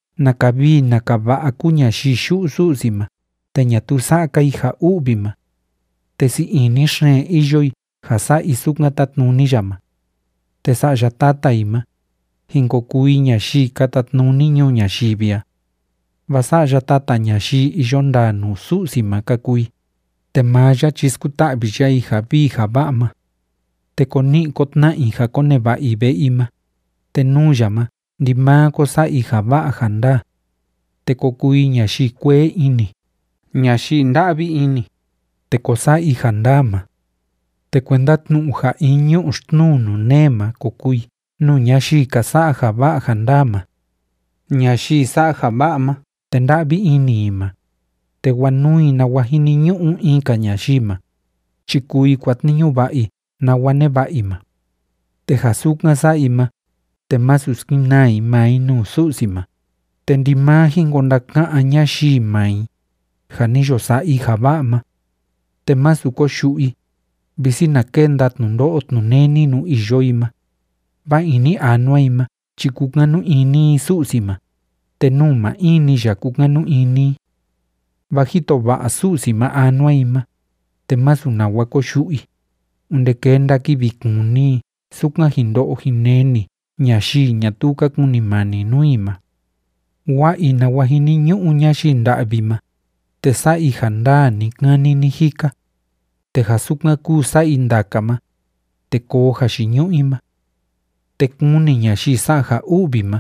¡Naka vii naka va'a kúu ñayii yu'u Su'si ma te ñatuu sa'a‑ka i ja u'vi ma! Te sii ini xeen iyo i ja sa'a i sukan tátnuni ya ma. Te sa'ya tata i ma, jin ko kuu i ñayii ka tatnuni ñuu ñayivi a. Vaa sa'ya tata ñayii iyo ndaa nuu Su'si ma ka kuu i, te maa ya chi skuta'vi ya i ja vii ja va'a ma. Te ko ni'i ko tna'a i ja koneva'a i ve'e i ma, te nuu ya ma ndimaa ko sa'a i ja va'a ja ndaa. Te ko kuu i ñayii kuee ini, ñayii nda'vi ini, te ko sa'a i ja ndaa ma. Te kuenda tnu'u ja in ñu'u xtnuu nuu nee ma ko kuu i nuu ñayii ka sa'a ja va'a ja ndaa ma. Ñayii sa'a ja va'a ma te nda'vi ini i ma, te wanuu i nawa jiniñu'u in‑ka ñayii ma, chi kuu i kuatniñu va'a i nawa neva'a i ma. Te ja sukan sa'a i ma, te masu skenaa i maa i nuu Su'si ma, te ndimaa jin ko ndaka'án ñayii maa i, ja ni yo sa'a i ja va'a ma. Te másu koyu'u i, visi na kenda tnundo'o tnuneni nuu iyo i ma, vaa ini anua i ma chi kúkanu ini i Su'si ma, te nuu maa in‑ni ya kúkanu ini i. Vaa jito va'a Su'si ma anua i ma, te másu nawa koyu'u i, onde kenda kivi kuni i sukan jin ndo'o jin neni ñayii ñatuu ka kunimani nuu i ma. Wa'a i nawa jiniñu'u ñayii nda'vi ma, te sa'a i ja ndaa ni‑kani ni‑jika, te ja sukan kúu sa'a i ndaka ma, te koo jayiñu'u i ma. Te kuni ñayii sa'a ja u'vi ma,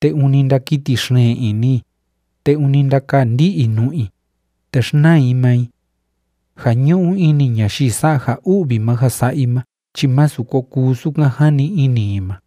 te ûni ndakiti xeen ini i, te ûni ndakaa ndi'i i nu'u i, te xnaa i maa i. Ja ñu'u ini ñayii sa'a ja u'vi ma ja sa'a i ma chi másu ko kuu sukan jani ini i ma.